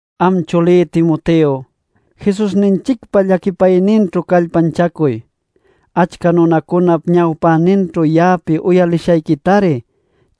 Am chulí Timoteo, Jesusninchicpa llaquipayninćhu callpanchacuy. Achca nunacunap ñawpäninćhu ya'api uyalishayquitari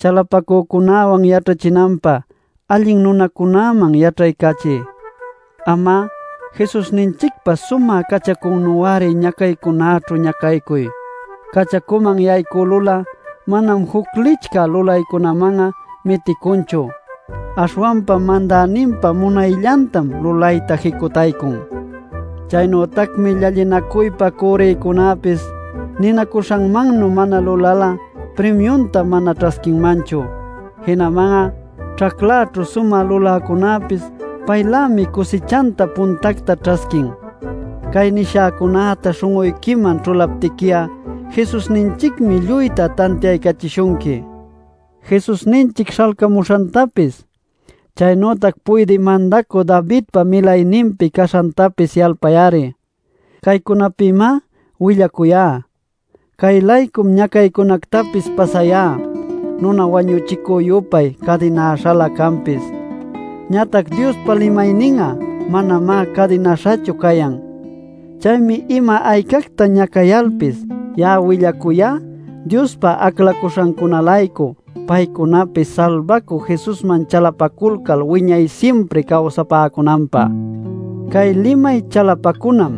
chalapacunawan yaćhachinanpä allin nunacunäman yaćhaycachiy. Am'a Jesusninchicpa sumä cachacunü-ari ñacaycunäćhu ñacaycuy. Cachacuman yaycülul'a manam juc licchä lulaycunaman'a miticunchu. Aśhwanpa mandäninpa munayllantam lulayta jicutaycun. Chaynütacmi llallinacuypä cürrïcunäpis ninacuśhanmannuy mana lulal'a primiunta mana ćhasquinmanchu. Jinaman'a ćhaclaćhu sumä luläcunäpis paylämi cusichanta puntacta ćhasquin. Cay nishäcunäta śhun'uyquiman ćhulaptiqui'a Jesusninchicmi lluyta tantiaycachishunqui. Jesusninchic śhalcamuśhantapis, chaynütac puydï mandacü Davidpa milayninpi caśhantapis yalpay-ari. Caycunapïmá willacuyá. Cay-laycum ñacaycunactapis pasayá, nuna wañuchicü-yupay cadinäśhalä canpis. Ñatac Diospa limaynin'a manamá cadinäśhachu cayan. Chaymi ima aycacta ñacayalpis ya'a willacuyá Diospa aclaśhancuna-laycu paycunapis salbacü Jesusman chalapaculcal wiñay simpri cawsapäcunanpä. Cay limay chalapacunam: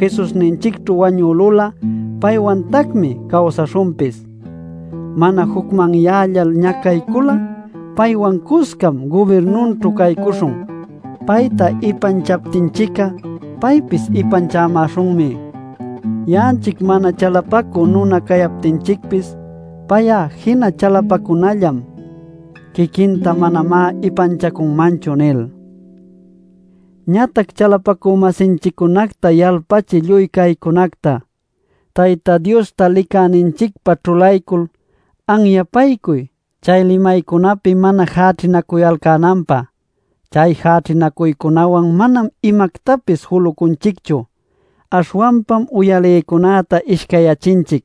Jesusninchicćhu wañülul'a, paywantacmi cawsaśhunpis. Mana jucmanyällal ñacaycul'a, paywan cuscam gubirnunćhu caycuśhun. Payta ipanchaptinchic'a, paypis ipanchamäśhunmi. Ya'anchic mana chalapacü nuna cayaptinchicpis, pay'a jina chalapacunallam. Quiquinta manamá ipanchacunmanchu, nil. Ñatac chalapacü-masinchiccunacta yalpachiy lluy caycunacta. Tayta Diosta licäninchicpa ćhulaycul anyapaycuy chay limaycunäpi mana jäćhinacuyalcänanpä. Chay jäćhinacuycunäwan manam imactapis julucunchichu, aśhwanpam uyalïcunäta ishcayyachinchic.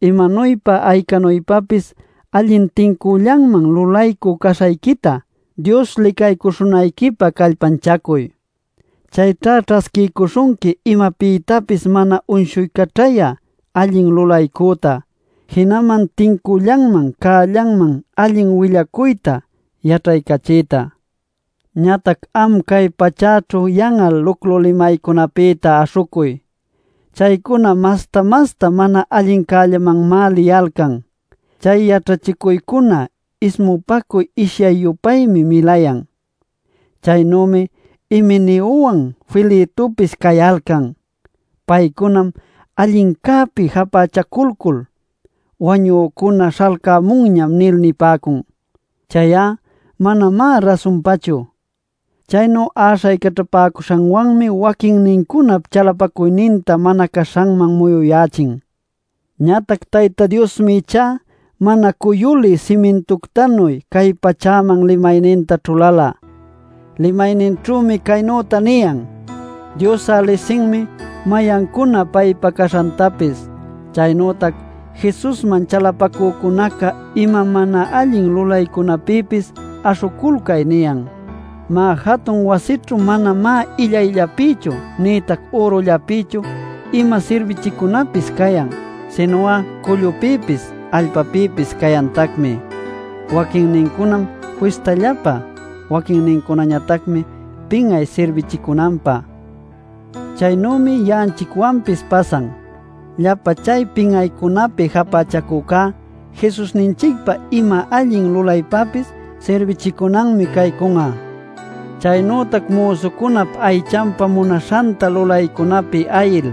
Imanuypa aycanuypapis allin tincüllanman lulaycü caśhayquita Dios licaycuśhunayquipä callpanchacuy. Chayćha ćhasquiycuśhunqui imapïtapis mana uyshuycaćhayä allin lulaycüta, jinaman tincüllanman cällanman allin willacuyta yaćhaycachïta. Ñatac am cay pachäćhu yan'al luclu limaycunapïta aśhucuy. Chaycuna masta-masta mana allincällamanmá liyalcan. Chay yaćhachicuycuna ismupacuy ishyay-yupaymi milayan. Chaynümi Himeneowan Filetopis cayalcan. Paycunam allincäpi japächaculcul: “Wañücuna śhalcämunñam” nil nipäcun. Chay'a manamá rasunpachu. Chaynu äśhaycaćhapäcuśhanwanmi waquinnincunap chalapacuyninta mana caśhanman muyuyächin. Ñatac Tayta Diosmi ichá mana cuyulï simintuctanuy cay pachäman limayninta ćhulala. Limayninćhümi caynüta niyan: “Dios'a lisinmi mayancuna paypa caśhantapis” chaynütac: “Jesusman chalapacücunacá ima mana allin lulaycunäpïpis aśhuculcay” niyan. Má, jatun wasićhu manamá illayllapïchu nïtac ürullapïchu ima sirbichicunapis cayan. Sinu'a cullupïpis, allpapïpis cayantacmi. Waquinnincunam fistallapä. Waquinnincunañatacmi pin'ay sirbichicunanpä. Chaynümi ya'anchicwanpis pasan: Llapa chay pin'aycunapi japächacücá Jesusninchicpa ima allin lulaypäpis sirbichicunanmi caycun'a. Chaynütac müsucunap aychanpa munaśhanta lulaycunapi ayil,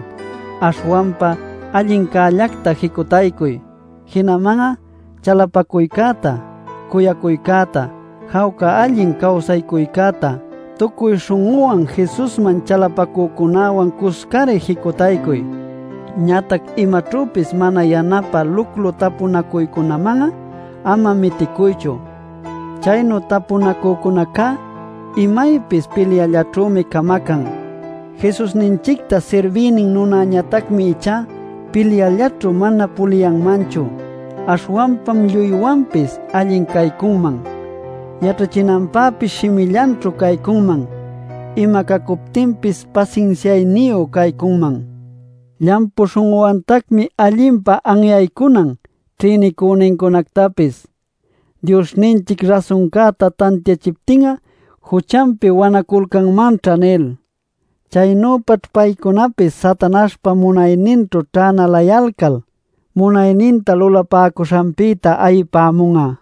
aśhwanpa allincällacta jicutaycuy. Jinaman'a chalapacuycäta, cuyacuycäta, jawca allin cawsaycuycäta tucuy śhun'uwan Jesusman chalapacücunäwan cuscari jicutaycuy. Ñatac imaćhüpis mana yanapä luclu tapunacuycunaman'a ama miticuychu. Chaynu tapunacücunacá imaypis pilyallaćhümi camacan. Jesusninchicta sirbïnin nunañatacmi ichá pilyallaćhu mana puliyanmanchu. Aśhwanpam lluywanpis allin caycunman, yaćhachinanpäpis shimillanćhu caycunman, ima cacuptinpis pasinsiayniyu caycunman. Llampu śhun'uwantacmi allinpa anyaycunan ćhïnicünincunactapis “Diosninchic rasuncäta tantiachiptin'a juchanpi wanaculcanmanćha” nil. Chaynüpaćh paycunapis Satanaśhpa munayninćhu ćhänalayalcal munayninta lulapäcuśhanpïta ayipämun'a.